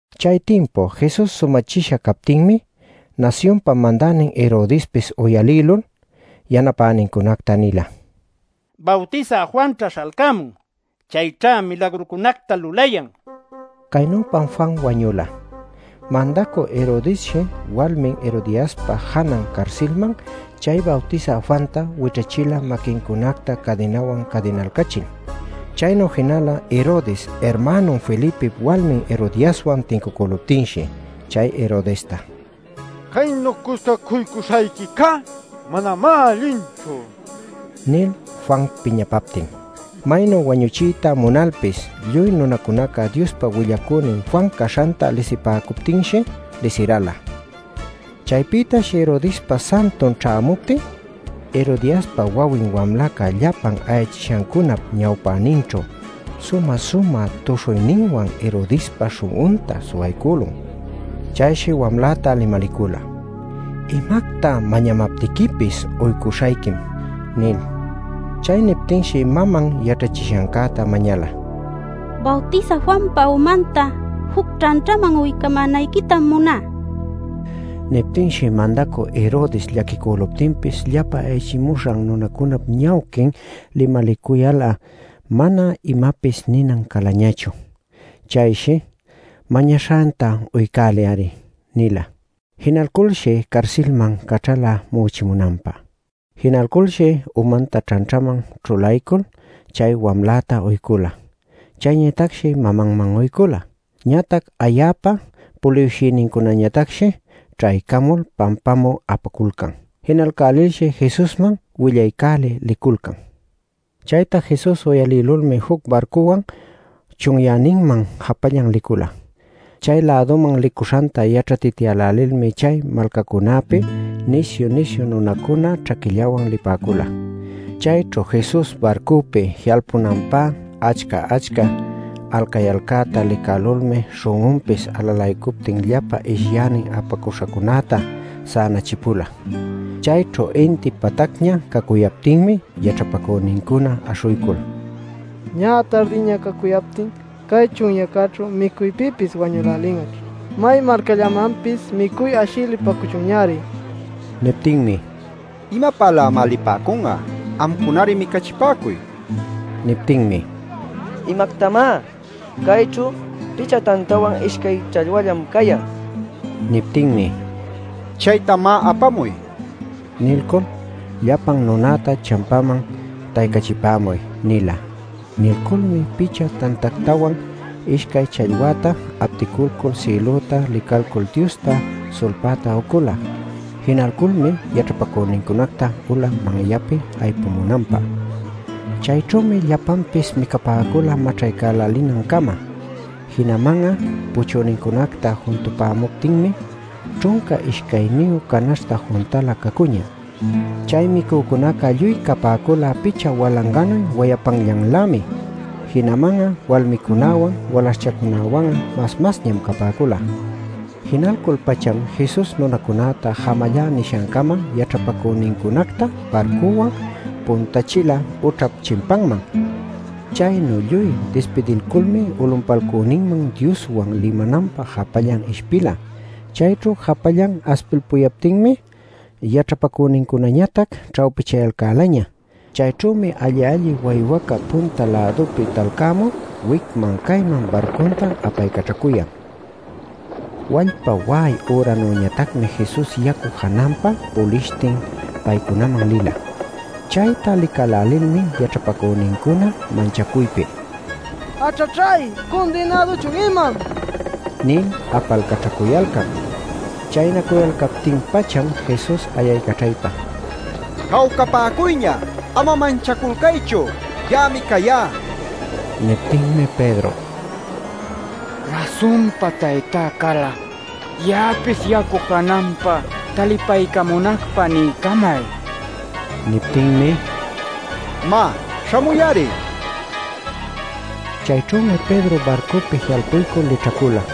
Chay timpu Jesus sumächisha captinmi nasyunpa mandänin Herodespis uyalïlul yanapänincunacta nila: “Bawtisä Juanćha śhalcämun; chayćhá milagrucunacta lulayan” nil. Caynüpam Juan wañula. Mandacü Herodesshi walmin Herodiaspa janan carsilman chay Bawtisä Juanta wićhächila maquincunacta cadinawan ćhänalcachil. Chaynu jinala Herodes irmänun Felipip walmin Herodiaswan tincucüluptinshi chay Herodesta: “Caynu cuscacuycuśhayquicá manamá allinchu” nil Juan piñapaptin. Maynu wañuchiyta munalpis lluy nunacunaca Diospa willacünin Juan caśhanta lisipäcuptinshi lisiräla. Chaypïtash Herodespa santun ćhämuptin Herodiaspa wawin wamlaca llapa ayachishancunap ñawpäninćhu sumä-sumä tuśhuyninwan Herodespa śhun'unta suwaycülun. Chayshi wamläta limalicüla: “Imacta mañamaptiquipis uycuśhayquim” nil. Chay niptinshi maman yaćhachishancäta mañala: “Bawtisä Juanpa umanta juc ćhanćhaman uycamänayquitam muná” nil. Niptinshi mandacü Herodes llaquicüluptinpis llapa ayachimuśhan nunacunap ñawquin limalicuyal'a mana imapis ninan calañachu. Chayshi “Mañaśhanta uycäliy-ari” nila. Jinalshi carsilcäman caćhala mu'uchinanpä. Jinalculshi umanta ćhanćhaman ćhulaycul chay wamläta uycula. Chayñatacshi mamanman uycula. Ñatac ayäpa puliwshïnincunañatacshi ćhaycamul pampapämü apaculcan. Jinalcälilshi Jesusman willaycälï liculcan. Chayta Jesus uyalïlulmi juc barcuwan chunyäninman japallan licula. Chay-läduman licuśhanta yaćhatityälälilmi chay malcacunapi nisyu-nisyu nunacuna ćhaquillawan lipäcula. Chayćhu Jesus barcupi ji'alpunanpä achca-achca alcayalcäta licälulmi śhun'unpis alalaycuptin llapa ishyänin apaśhancunäta sänachipula. Chayćhu inti patacña cacuyaptinmi yaćhapacünincuna aśhuycul: “Ñä tardiña cacuyaptin cay chunyäcäćhu micuypïpis wañülälin'aćh. May malcallamanpis micuy ashï lipäcuchunñari” nipäcun. Niptinmi: “¿Imapälämá lipäcun'a? Amcunari micachipäcuy” nin. Niptinmi: “¿Imactamá? Cayćhu picha tantawan ishcay challwallam cayan” nin. Niptinmi: “Chayta, má, apamuy” nin. Nilcul “Llapan nunäta champäman taycachipämuy” nila. Nilculmi picha tantätawan, ishcay challwäta apticulcul sïlüta licalcul Diosta sulpayta ucula. Jinalculmi yaćhapacünincunacta ula manyapi aypumunanpä. Chayćhümi llapanpis micapäcula maćhaycälinancama. Jinaman'a puchünincunacta juntapäcuptinmi ćhunca ishcayniyu canaśhta juntalä cacuñä. Chay micücunaca lluy capäcula picha walanganuy wayapanllanlämi. Jinaman walmicunäwan walaśhchacunäwan'a mas masñam capäcula. Jinalcul-pacham Jesus nunacunäta jamallá nishancama yaćhapacünincunacta barcuwan puntächila ućhap chimpanman. Chaynu lluy dispidilculmi ulunpalcüninman Dioswan limananpä japallan ishpila. Chayćhu japallan aspilpuyaptinmi yaćhapacünincunañatac ćhawpichayalcälaña. Chayćhümi alli-alli waywaca punta-lädupi talcämul wicman cayman barcunta apaycaćhacuyan. Wallpa wa'ay üranüñatacmi Jesus yacu jananpa pulishtin paycunaman lila. Chayta licälälilmi yaćhapacünincuna manchacuypi: “¡Aćhaćhay! ¡¿Cundinäduchun imam?!” nil apalcaćhacuyalcan. Chaynacuyalcaptin-pacham Jesus ayaycaćhaypa: “¡Jawcapäcuyña! ¡Ama manchaculcaychu! ¡Ya'ami cayá!” nila. Niptinmi Pedro: “Rasunpa Taytá cal'a ya'apis yacu jananpa talipaycamunacpä niycamay” nin. Niptinmi “Má, śhamuy-ari” nin. Chayćhümi Pedro barcupi ji'alpuycul lićhacula.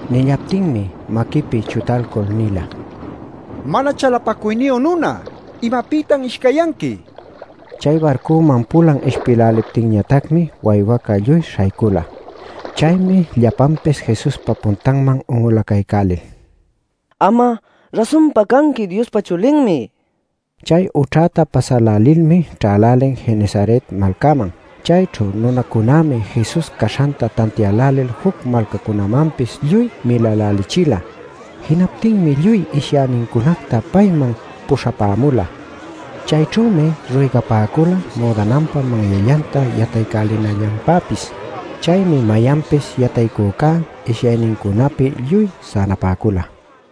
Nillaptinmi maquipi chutalcul nila: “¡Mana chalapacuyniyu nuna! ¿Imapïtan ishcayyanqui?” nil. Chay barcuman pulan ishpïläliptinñatacmi waywaca lluy śhaycüla. Chaymi llapanpis Jesuspa puntanman un'ulacaycälil: “Am'a rasunpa canqui Diospa Chulinmi” nipäcula. Chay ućhäta pasälälilmi ćhälälin Genesaret malcäman. Chayćhu nunacunämi Jesus caśhanta tantiälälil juc malcacunamanpis lluy milälälichila. Jinaptinmi lluy ishyänincunacta payman puśhapämula. Chayćhümi ruygapäcula müdananpa manyallanta yataycälinallanpäpis. Chaymi mayanpis yataycücá ishyaynincunapi lluy sänapäcula.